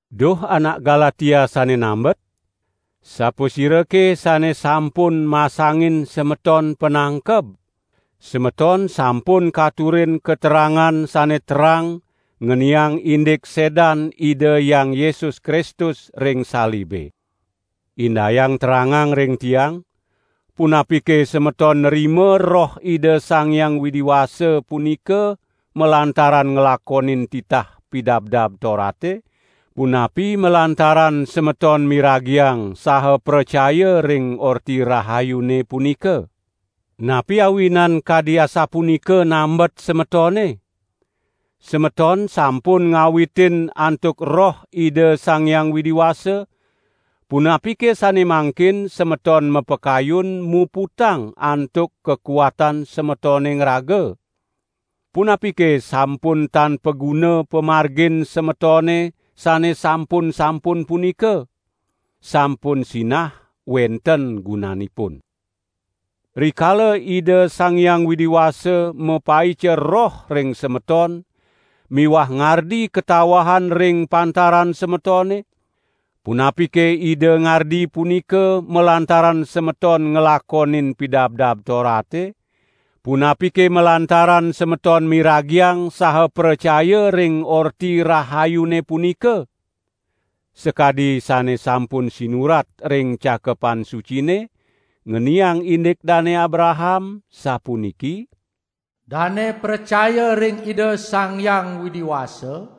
Duh anak Galatia sane nambet! Sapasirake sane sampun masangin semeton panangkeb? Semeton sampun katurin katerangan sane terang ngeniang indik sedan Ida Hyang Yesus Kristus ring salibe. Indayang terangang ring tiang, punapike semeton nrima Roh Ida Sang Hyang Widi Wasa punika malantaran nglakonin titah Pidabdab Torate, punapi malantaran semeton miragiang saha pracaya ring Orti Rahayune punika? Napi awinan kadi asapunika nambet semetone? Semeton sampun ngawitin antuk Roh Ida Sang Hyang Widi Wasa; punapike sane mangkin semeton mapakayun muputang antuk kakuatan semetone ngraga? Punapike sampun tan paguna pamargin semetone sane sampun-sampun punika? Sampun sinah wenten gunanipun. Rikala Ida Sang Hyang Widi Wasa mapaica Roh ring semeton miwah ngardi katawahan ring pantaran semetone, punapike Ida ngardi punika malantaran semeton nglakonin Pidabdab Torate, punapike malantaran semeton miragiang saha pracaya ring Orti Rahayune punika? Sakadi sane sampun sinurat ring Cakepan Sucine, ngeniang indik Dane Abraham, sapuniki: "Dane pracaya ring Ida Sang Hyang Widi Wasa,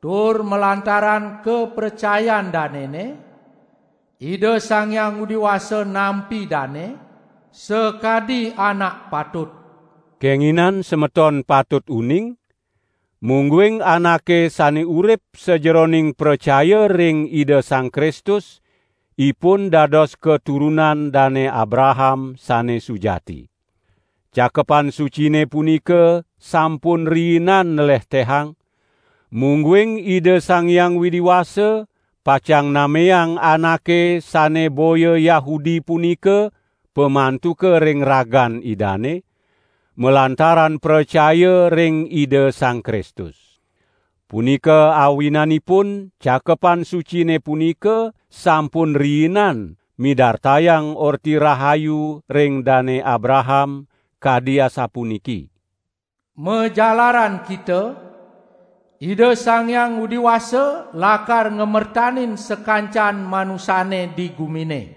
tur malantaran kapracayan danene, Ida Sang Hyang Widi Wasa nampi dane sakadi anak patut." Kenginan semeton patut uning, mungguing anake sane urip sajeroning pracaya ring Ida Sang Kristus ipun dados katurunan Dane Abraham sane sujati. Cakepan Sucine punika sampun riinan nlehtehang, mungguing Ida Sang Hyang Widi Wasa pacang nameang anake sane boya Yahudi punika pamantuka ring ragan Idane, malantaran pracaya ring Ida Sang Kristus. Punika awinanipun Cakepan Sucine punika sampun riinan midartayang Orti Rahayu ring Dane Abraham kadi asapuniki: "Majalaran kita, Ida Sang Hyang Widi Wasa lakar ngamertanin sakancan manusane di gumine."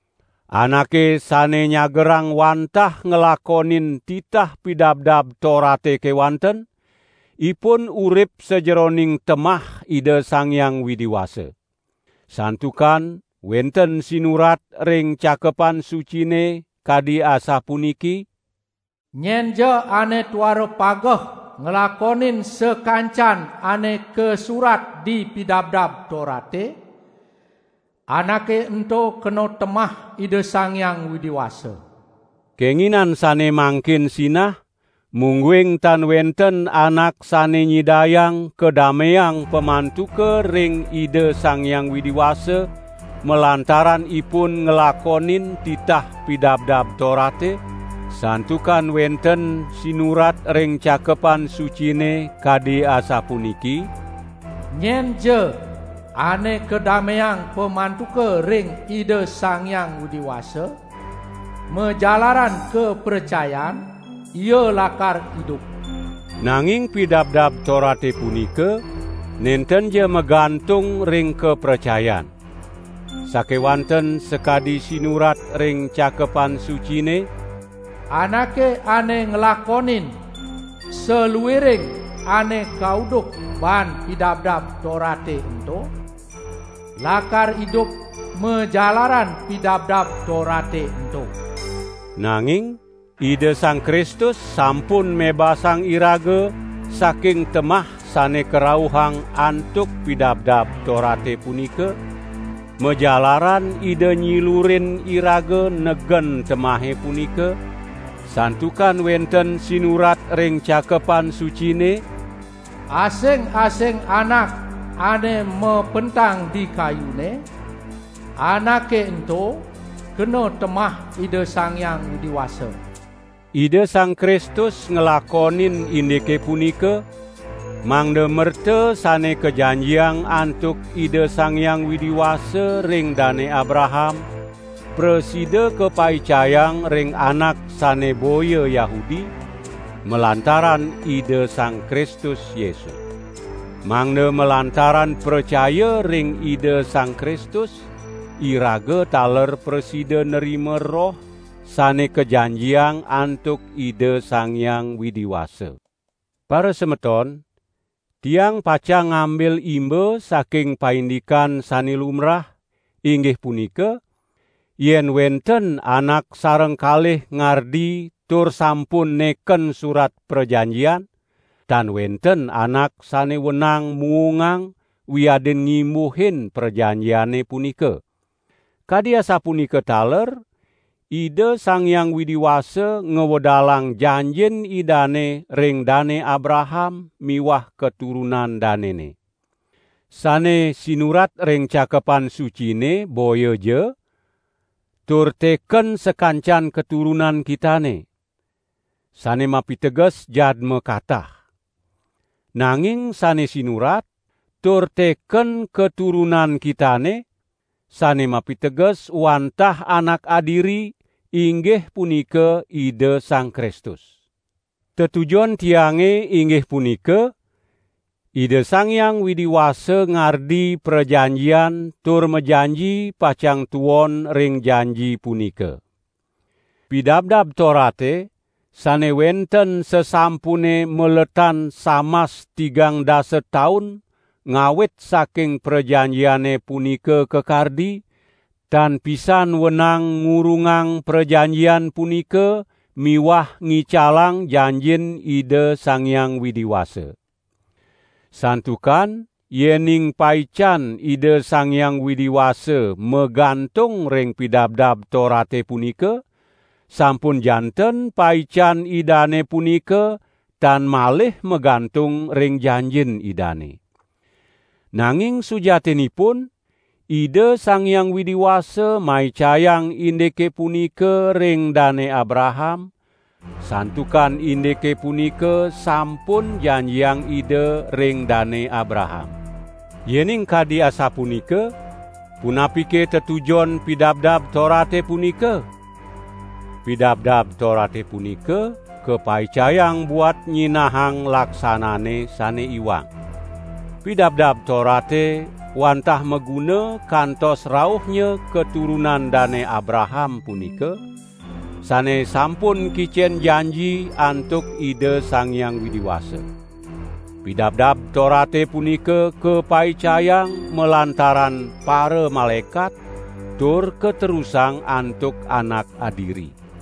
Anake sane nyagerang wantah nglakonin titah Pidabdab Torate kewanten, ipun urip sajeroning temah Ida Sang Hyang Widi Wasa. Santukan wenten sinurat ring Cakepan Sucine kadi asapuniki: "Nyenja ane tuara pageh nglakonin sakancan ane kasurat di Pidabdab Torate, anake ento kena temah Ida Sang Hyang Widi Wasa." Kenginan sane mangkin sinah, mungguing tan wenten anak sane nyidayang kadameang pamantuka ring Ida Sang Hyang Widi Wasa malantaran ipun nglakonin titah Pidabdab Torate; santukan wenten sinurat ring Cakepan Sucine kadi asapuniki: "Nyenja ane kadameang pamantuka ring Ida Sang Hyang Widi Wasa, majalaran kapracayan, ia lakar idup." Nanging Pidabdab Torate punika, nentenja magantung ring kapracayan. Sakewanten sakadi sinurat ring Cakepan Sucine: "Anake ane nglakonin saluiring ane kauduh baan Pidabdab Torate ento, lakar idup majalaran Pidabdab Torate ento." Nanging Ida Sang Kristus sampun mebasang iraga saking temah sane karauhang antuk Pidabdab Torate punika, majalaran Ida nyilurin iraga negen temahe punika, santukan wenten sinurat ring Cakepan Sucine: "Asing-asing anak ane mapentang di kayune, anake ento kena temah Ida Sang Hyang Widi Wasa." Ida Sang Kristus nglakonin indike punika, mangda merta sane kajanjiang antuk Ida Sang Hyang Widi Wasa ring Dane Abraham, prasida kapaicayang ring anak sane boya Yahudi, malantaran Ida Sang Kristus Yesus. Mangda malantaran pracaya ring Ida Sang Kristus, iraga taler prasida nrima Roh sane kajanjiang antuk Ida Sang Hyang Widi Wasa. Parasemeton! Tiang pacang ngambil imba saking paindikan sane lumbrah, inggih punika: yen wenten anak sareng kalih ngardi tur sampun neken surat prajanjian, tan wenten anak sane wenang muungang wiadin ngimbuhin prajanjiane punika. Kadi asapunika taler, Ida Sang Hyang Widi Wasa ngwedalang janjin Idane ring Dane Abraham miwah katurunan danene. Sane sinurat ring Cakepan Sucine, boyaja: "Tur teken sakancan katurunan kitane." Sane mapiteges jadma katah. Nanging sane sinurat: "Tur teken katurunan kitane," sane mapiteges wantah anak adiri, inggih punika, Ida Sang Kristus. Tetujon tiange, inggih punika: Ida Sang Hyang Widi Wasa ngardi prajanjian tur majanji pacang tuon ring janji punika. Pidabdab Torate sane wenten sasampune maletan samas tigang dasa taun ngawit saking prajanjiane punika kakardi, tan pisan wenang ngurungang prajanjian punika miwah ngicalang janjin Ida Sang Hyang Widi Wasa. Santukan yening paican Ida Sang Hyang Widi Wasa magantung ring Pidabdab Torate punika, sampun janten paican Idane punika tan malih magantung ring janjin Idane. Nanging sujatinipun, Ida Sang Hyang Widi Wasa maicayang indike punika ring Dane Abraham, santukan indike punika sampun janjiang Ida ring Dane Abraham. Yening kadi asapunika, punapike tetujon Pidabdab Torate punika? Pidabdab Torate punika kapaicayang buat nyinahang laksanane sane iwang. Pidabdab Torate wantah maguna kantos rauhnya katurunan Dane Abraham punika, sane sampun kicen janji antuk Ida Sang Hyang Widi Wasa. Pidabdab Torate punika kapaicayang malantaran paramalaekat, tur katerusang antuk anak adiri.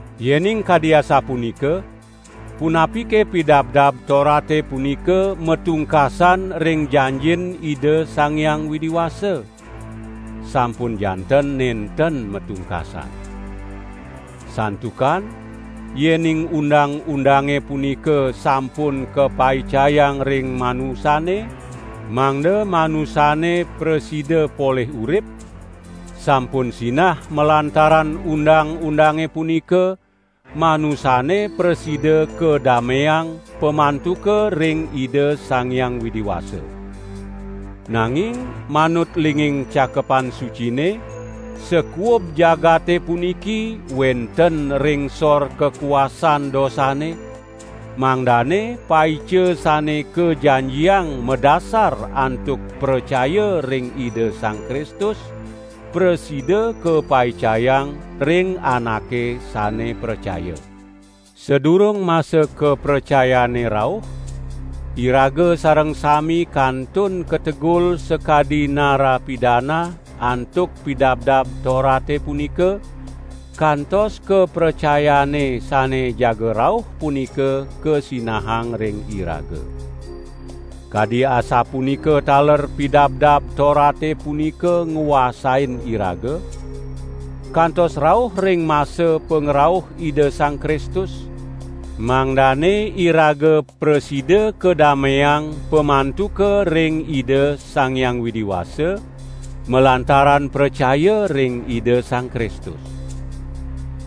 Yening kadi asapunika, punapike Pidabdab Torate punika matungkasan ring janjin Ida Sang Hyang Widi Wasa? Sampun janten nenten matungkasan. Santukan yening undang-undange punika sampun kapaicayang ring manusane, mangda manusane prasida polih urip, sampun sinah malantaran undang-undange punika, manusane prasida kadameang pamantuka ring Ida Sang Hyang Widi Wasa. Nanging manut linging Cakepan Sucine, sakuub jagate puniki wenten ring sor kakuasan dosane, mangdane paica sane kajanjiang madasar antuk pracaya ring Ida Sang Kristus, prasida kapaicayang ring anake sane pracaya. Sadurung masa kapracayane rauh, iraga sareng sami kantun kategul sakadi narapidana antuk Pidabdab Torate punika, kantos kapracayane sane jaga rauh punika kasinahang ring iraga. Kadi asapunika taler Pidabdab Torate punika nguasain iraga, kantos rauh ring masa pangrauh Ida Sang Kristus, mangdane iraga prasida kadameang pamantuka ring Ida Sang Hyang Widi Wasa, malantaran pracaya ring Ida Sang Kristus.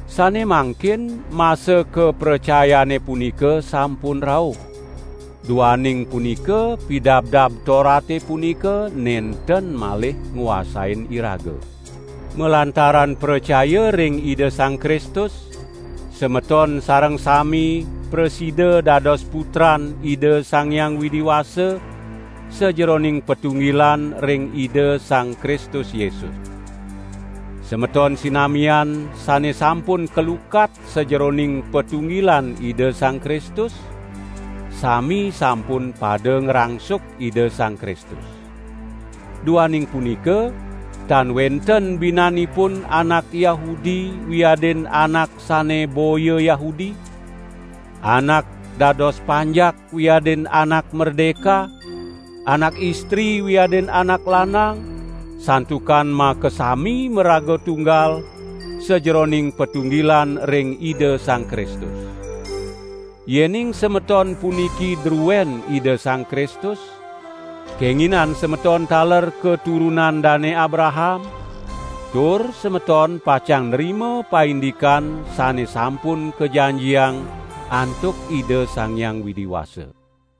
Sane mangkin masa kapracayane punika sampun rauh, duaning punika Pidabdab Torate punika nenten malih nguasain iraga. Malantaran pracaya ring Ida Sang Kristus, semeton sareng sami prasida dados putran Ida Sang Hyang Widi Wasa, sajeroning patunggilan ring Ida Sang Kristus Yesus. Semeton sinamian sane sampun kalukat sajeroning patunggilan Ida Sang Kristus, sami sampun pada ngrangsuk Ida Sang Kristus. Duaning punika tan wenten binanipun anak Yahudi wiadin anak sane boya Yahudi, anak dados panjak wiadin anak merdeka, anak istri wiadin anak lanang, santukan makasami maraga tunggal sajeroning patunggilan ring Ida Sang Kristus. Yening semeton puniki druen Ida Sang Kristus kenginan semeton taler katurunan Dane Abraham, tur semeton pacang nrima paindikan sane sampun kajanjiang antuk Ida Sang Hyang Widi Wasa.